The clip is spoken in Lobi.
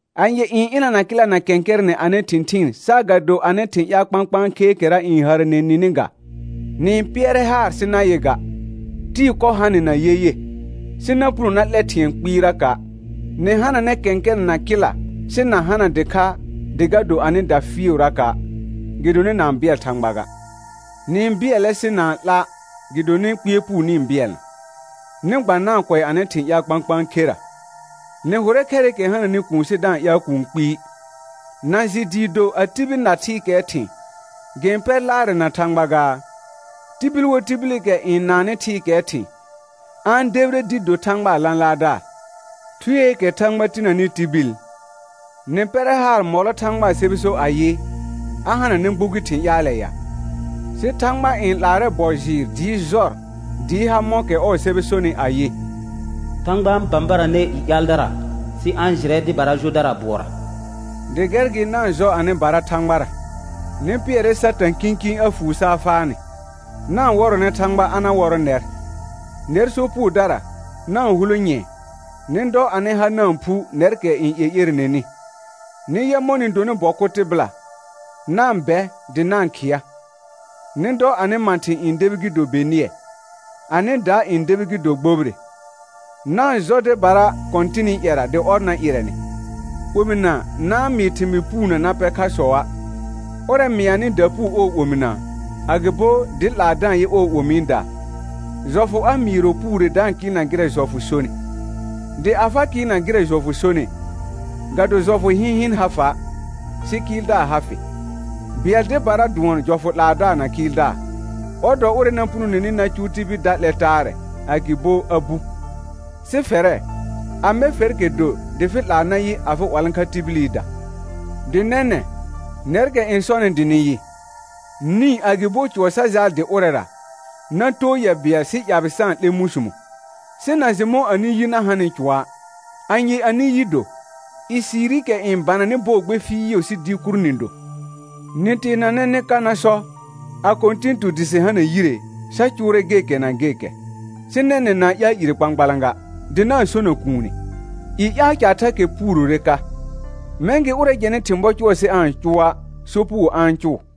Anye n ɩnana kɩla na kɛ̃kɛrɛnɛ anɩ thɩ̃thɩɩn saagado anɩ thɩ̃ ƴaal kpãkpãa kheekɛra n hərəne nini ga? Nɩ-n pɩɛrɛ haar sɩ na yɩ ga; tɩɩ kɔ ha nɩ na yeye, sɩ na puno na 'lɛ thɩ̃ɛ kpɩɩraka'. Nɩ hananɛ kɛ̃kɛrɛnɛ na kɩla sɩ na hana dɩkha dɩ ga do anɩda fɩɩʋraka', gɩdonɩ na-n bɩɛl Thãgba ga. Nɩ-n bɩɛlɛ sɩ na-n 'la' gɩdonɩ kpɩɛr puu nɩ-n bɩɛlna, nɩ gba na-n kʋɛ anɩ thɩ̃ ƴaal kpãkpãa khera. Nɩ hʋrɛ khɛrɩkɛ hananɩ kuun sɩ da-n ƴaal kũu kpɩɩ. Na jɩ dɩɩ do a tibil na thɩɩkɛɛ thɩ̃, gɩ-n pɛr laarɛ na Thãgba gaa? Tibil wo tibilikɛ n naannɩ thɩɩkɛɛ thɩ̃, a-n debire dɩ do Thãgbaa lãlaardaar. Thueekɛ Thãgba tinəni tibil, nɩ pɛrɛ haar mɔlɔ Thãgbaa sɛbɛ so ayɩ, a hananɛ gbugi thɩ̃ ƴaalɛ ya? Sɩ Thãgba n 'laarɛ bɔ jɩɩr dɩɩ jɔr dɩɩ ha mɔ̃kɛ ɔɔ sɛbɛ sonɩ ayɩ: «Thãgba n bãbaranɛ i ƴaaldara, sɩ a-n jɩrɛ dɩbara jodara bʋɔra.» Dɩ gɛr gɩ na-n jɔ anɩbara Thãgbara, nɩ pɩɛrɛ Satã kĩkĩ a fuu saa faa nɩ. Na-n wɔrɔnɛ Thãgba a na wɔrɔ̃ nɛr. Nɛr sopugodara, na-n hulo nyɛ̃ɛ, nɩ dɔ anɩ ha na-n phu nɛrkɛ n ƴeƴerenenɩ. Nɩ yɛ mɔ̃ nɩ donɩ bɔ kʋ tɩbɩla; na-n bɛ dɩ na-n khɩa. Nɩ dɔ anɩ mãthɩ̃ n debi gɩ do benɩɛ, anɩ da n debi gɩ do gbobire. Na-n jɔ dɩbara Kɔ̃tɩnɩ ƴɛra dɩ ɔr na ɩrɛ nɩ. Omɩna na-n mɩɩ thɩmɩɩ puunə na pɛ khasɔa'. Ʋrɛ mɩanɩ dapuu ɔɔ omina, agɩbo dɩ 'laa da-n yɩ ɔɔ omiida, jɔfʋ a mɩɩrɔ puure da-n kɩɩlna gɩrɛ jɔfʋ sonɩ. Dɩ a fa kɩɩlna gɩrɛ jɔfʋ sonɩ, ga do jɔfʋ hɩ̃hɩn ha fa', sɩ kɩɩldaar ha fɩ. Bɩɛl dɩbara dʋɔn jɔfʋ 'laadaar na kɩɩldaar; ɔr dɔ ʋrɛ na punoneni na cʋʋ tibil da 'lɛ taarɛ, agɩbo a bu. Sɩ fɛrɛ, amɛ fɛrkɛ do dɩ fɩ 'laa na yɩ afɩ 'walãkha tibilida. Dɩ nɛnɛ̃, nɛrkɛ n sɔnɩ dɩ nɩ yɩ: Nĩ agɩbo cʋɔ sa jaal dɩ ʋrɛra, na too yɛ bɩɛl sɩ ƴabɩ sa-n 'lɛ mũsumo, sɩ na jɩ mɔ̃ anɩ yi na hanɩ cʋɔa'. Anye anɩ yi do? Ɩsiirikɛ n bananɩ bɔɔ gbe fɩɩʋ sɩ dɩɩ kur nɩ do. Nɩ teenanɛ nɩ ka na sɔ: A Kɔ̃tɩn tu dɩ sɩ hana yire, sa cʋʋrɛ gekɛ na gekɛ. Sɩ nɛnɛ̃ na-n ƴaal ire kpãkpalã ga, dɩ na-n sona kuune. I ƴaal caar thakɛ puurore ka. Mɛ̃ gɩ ʋrɛ jɛnɩ thɩ̃ bɔ cʋʋrɛ sɩ aa-n cʋa', sopugo a-n cʋʋ.